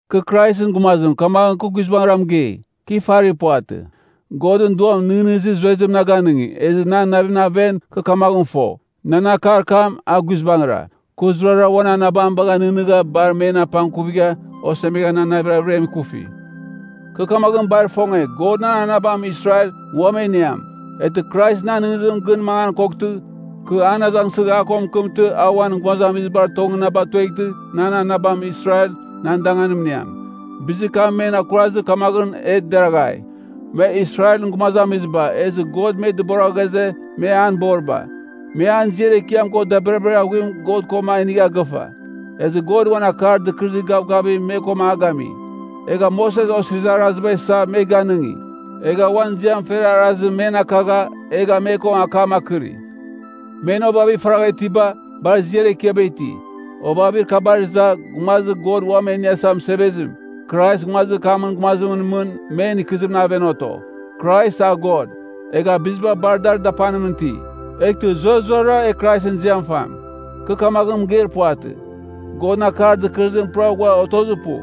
Kɨ Kraisɨn gumazim, kamaghɨn kɨ guizbangɨra mɨgei, kɨ ifarir puvatɨ. Godɨn Duam nɨghnɨzir zuezim na ganɨngi, ezɨ nan navimɨn aven kɨ kamaghɨn fo, nan akar kam a guizbangɨra. Kɨ zurara uan anabam bagha nɨghnɨgha, bar men apangkuvigha, osemegha nan navir averiam ikufi. Kɨ kamaghɨn bar ifonge, God nan anabam Israel, ua men iniam. Eghtɨ Krais nan nɨghnɨzimɨn gɨn mangan koghtɨ, kɨ an azangsɨgh a ko mɨkɨmtɨ, a uan gumazamizibar tongɨn na batueghtɨ, nan anabam Israel nan danganim iniam. Bizir kam men akurazɨ, kamaghɨn a deraghai. Me Israelɨn gumazamiziba, ezɨ God me dɨbora ghaze, me an boriba. Me an ziar ekiam ko dabirabir aghuim God koma inigha gɨfa. Ezɨ God uan Akar Dɨkɨrɨzir Gavgavim me ko a gami. Egha Moses Osirizir Araziba isa, me ganɨngi. Egha uan ziam fer arazim men akagha, egha me ko akam akɨri. Men ovavir faragha itiba, bar ziar ekiaba iti. Ovavir kabar iza, Gumazir God Uam E Iniasa Mɨsevezim, Krais nguazir kamɨn gumazimɨn mɨn men ikɨzimɨn aven oto. Krais a God, egha biziba bar dar dapanimɨn iti. Eghtɨ zurazurara e Kraisɨn ziam fam! Kɨ kamaghɨn mɨgeir puvatɨ, Godɨn akar dɨkɨrɨzim pura ghua otozir pu.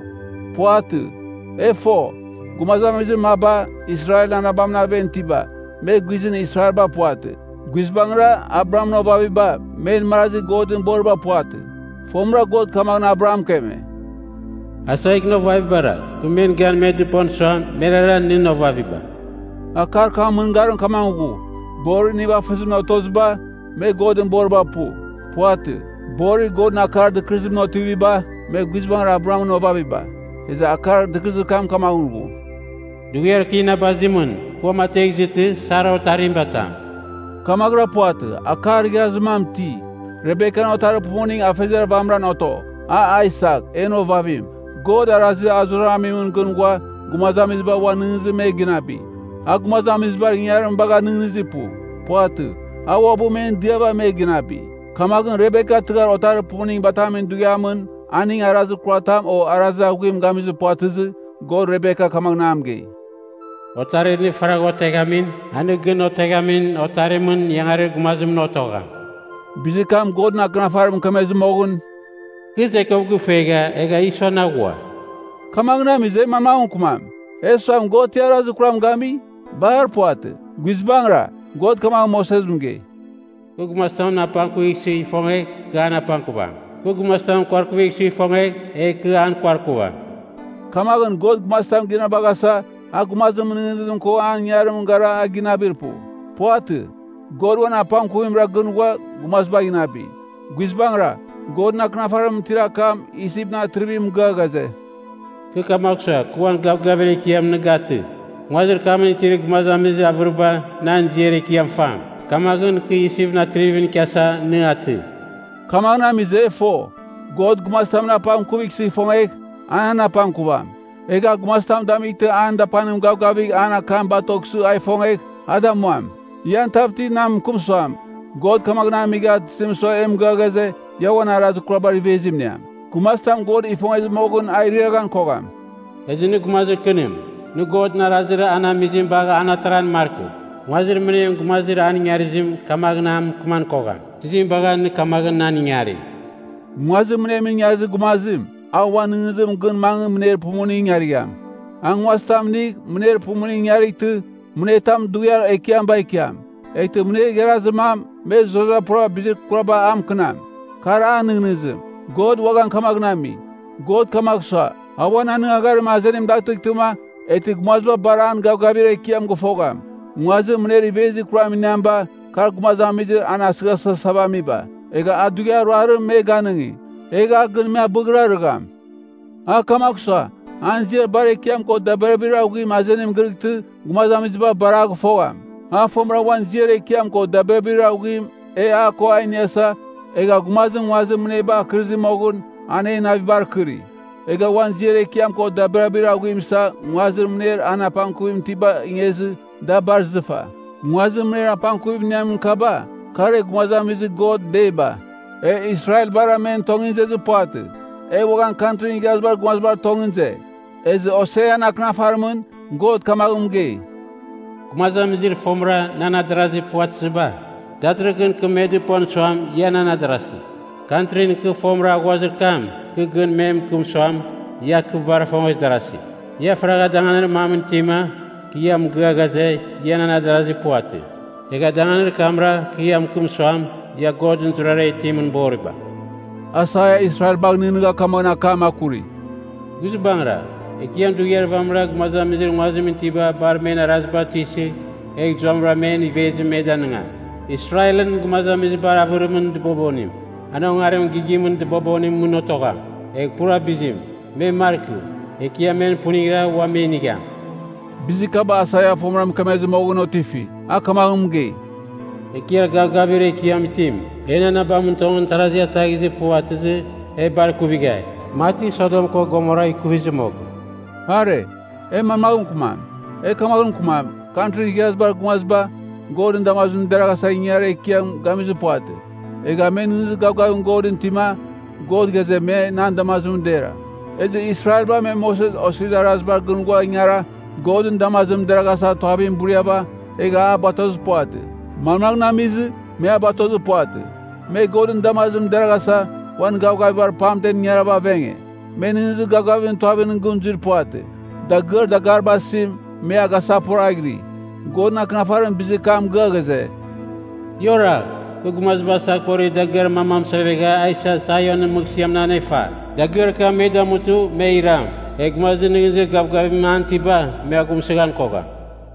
Puvatɨ. E fo, gumazamizir maba, Israelɨn anabamɨn aven itiba, me guizɨn Israelba puvatɨ. Guizbangɨra, Abrahamɨn ovaviba, men marazi Godɨn boriba puvatɨ. Fomɨra God kamaghɨn Abraham mɨkeme, “Aisakɨn ovavibara, kɨ men gan me dɨpon suam, merara nɨn ovaviba.” Akar kamɨn mɨngarim kamaghɨn ghu, borir nivafɨzimɨn otoziba, me Godɨn boriba pu. Puvatɨ. Borir Godɨn akar dɨkɨrɨzimɨn otiviba, me guizbangɨra Abrahamɨn ovaviba. Ezɨ akar dɨkɨrɨzim kamaghɨn ghu, “Dughiar kɨ inabazimɨn, kɨ uamategh izɨtɨ, Sara otarim batam.” Kamaghɨra puvatɨ, akar igharazir mam iti: Rebekan otarir pumuning afeziar vamɨran oto, a Aisak, en ovavim. God arazir a zurara amimɨn gɨn ghua, gumazamiziba uan nɨghnɨzimɨn me ginabi. A gumazamizibar ingangarim bagha nɨghnɨzir pu. Puvatɨ. A uabɨ men diava me ginabi. Kamaghɨn Rebeka tɨghar otarir pumuning batamin dughiamɨn, aning arazir kuratam o arazir aghuim gamizir puvatɨzɨ, God Rebeka kamaghɨn a mɨgei, “Otarir nɨ faragh oteghamim, a nɨ gɨn oteghamin otarimɨn ingarir gumazimɨn otogham.” Bizir kam, Godɨn Akɨnafarim mɨkemezir moghɨn, “Kɨ Jakob gifongegha, egha Ison aghua.” Kamaghɨn amizɨ, e manmaghɨn mɨkɨmam? E suam, God ti arazir kuram gami? Bar puvatɨ! Guizbangɨra, God kamaghɨn Moses mɨgei, “Kɨ gumazitamɨn apangkuvighsɨ ifongegh, kɨ an apangkuvam. Kɨ gumazitamɨn kuarkuvighsɨ ifongegh, egh kɨ an kuarkuvam.” Kamaghɨn God gumazitam ginabaghasa, a gumazimɨn nɨghnɨzim ko an ingangarimɨn gara a ginabir pu. Puvatɨ. God uan apangkuvimra gɨn ghua gumazibagh inabi. Guizbangɨra, Godɨn Akɨnafarimɨn itir akam Isipɨn atrivim mɨgɨa ghaze, “Kɨ kamagh sua, kɨ uan gavgavir ekiam nɨn akaghtɨ, nguazir kamɨn itir gumazamizir avɨriba nan ziar ekiam fam. Kamaghɨn, kɨ Isipɨn atrivimɨn ikiasa nɨ atɨ.” Kamaghɨn amizɨ e fo, God gumazitamɨn apangkuvighsɨ ifongegh, an an apangkuvam. Egh a gumazitam damightɨ an dapanim gavgavigh an akam batoghsɨ a ifongegh, a damuam. Ian tav ti na mɨkɨm suam, “God kamaghɨn amigha, tizim sua e mɨgɨa ghaze, ‘Ia uan arazir kurabar ivezim iniam?’ Gumazitam God ifongezɨ moghɨn a iriaghan kogham.” Ezɨ nɨ gumazir kɨnim! Nɨ Godɨn arazir an amizim bagh an ataran markɨ! Nguazir mɨnem gumazir an ingarizim kamaghɨn a mɨkɨman kogham, “Tizim bagha nɨ kamaghɨn nan ingari?” Nguazir mɨnemɨn ingarizir gumazim, a uan nɨghnɨzimɨn gɨn mangɨ mɨner pumuning ingarigham. A nguazitam inigh, mɨner pumuning ingarightɨ, mɨner tam dughiar ekiam bagh ikiam, eghtɨ mɨner igharazir mam, me zurara pura bizir kuraba a mɨkɨnam. Kar an nɨghnɨzim. God uaghan kamaghɨn ami. God kamagh sua, a uan anɨngagharim azenim datɨghtɨma, eghtɨ gumaziba bar an gavgavir ekiam gɨfogham. Nguazir mɨner ivezir kuram iniamiba, kar gumazamizir an asɨghasɨghasava amiba, egha a dughiar ruarim me ganɨngi, egh a gɨn me abɨghrarɨgham. A kamagh sua, an ziar bar ekiam ko dabirabir aghuim azenim gɨrɨghtɨ, gumazamiziba bar a gɨfogham. A fomɨra a uan ziar ekiam ko dabirabir aghuim e a ko da iniasa, egha gumazim nguazir mɨneba akɨrizir moghɨn, an en navibar akɨri. Egha uan ziar ekiam ko dabirabir aghuim isa, nguazir mɨner an apangkuvim itibagh ingezɨ, da bar izɨfa. Nguazir mɨner apangkuvim iniamin kaba, kar e gumazamizir God deiba. E Israelbara men tongɨn izezir puvatɨ, e uaghan Kantrin Igharazibar Gumazibar tongɨn ize. Ezɨ Hosean akɨnafarimɨn, God kamaghɨn mɨgei, “Gumazamizir fomɨra nan adarazi puvatɨziba, datɨrɨghɨn kɨ me dɨpon suam, ia nan adarasi. Kantrin kɨ fomɨra aghuazir kam, kɨ gɨn me mɨkɨm suam, ia kɨ bar ifongezi darasi. Ia faragha danganir mamɨn itima kɨ ia mɨgɨa ghaze, ia nan adarazi puvatɨ. Egha danganir kamnaghra kɨ ia mɨkɨm suam, Ia Godɨn zurazurara itimɨn boriba.” Aisaia Israelbagh nɨghnɨgha kamaghɨn akam akuri, “Guizbangɨra, Ekiam dughiar vamɨra gumazamizir nguazimɨn itiba bar men araziba tuisɨgh, egh zuamɨra men ivezim me danigam. Israelɨn gumazamizibar avɨrimɨn dɨbobonim, an ongarimɨn gigimɨn dɨbobonimɨn mɨn otogham, egha pura bizim, me markɨ. Ekiam men puningra ua me inigham.” Bizir kaba Aisaia fomɨra mɨkemezɨ moghɨn otifi, a kamaghɨn mɨgei, “Ekiar Gavgavir Ekiam Itim, en anabamɨn tongɨn tarazi ataghizɨ puvatɨzɨ, e bar ikuvighai, mati Sodom ko Gomora ikuvizɨ moghɨn.” Are, e manmaghɨn mɨkɨmam? E kamaghɨn mɨkɨmam, Kantrin Igharazibar Gumaziba, Godɨn damazimɨn deraghasa ingangarir ekiam gamizir puvatɨ. Egha me nɨghnɨzir gavgavim Godɨn itima, God ghaze, me nan damazimɨn dera. Ezɨ Israelba me Moses Osirizir Arazibar gɨn ghua ingara, Godɨn damazimɨn deraghasa tuavim buriava, egha a batozir puvatɨ. Manmaghɨn amizɨ, me a batozir puvatɨ? Me Godɨn damazimɨn deraghasa, uan gavgavibar pamtem ingarava avenge. Me nɨghnɨzir gavgavimɨn tuavimɨn gɨn zuir puvatɨ. Dagɨar dagariba asim, me a gasaghporaghiri. Godɨn Akɨnafarim bizir kam mɨgɨa ghaze, “Ia oragh! Kɨ gumaziba asaghporir dagɨar mam amɨsevegha a isa Sionɨn mɨghsɨamɨn anefa. Dagɨar kam me damutɨ me iram. Egh gumazir nɨghnɨzir gavgavim an itiba, me aghumsɨghan kogham.”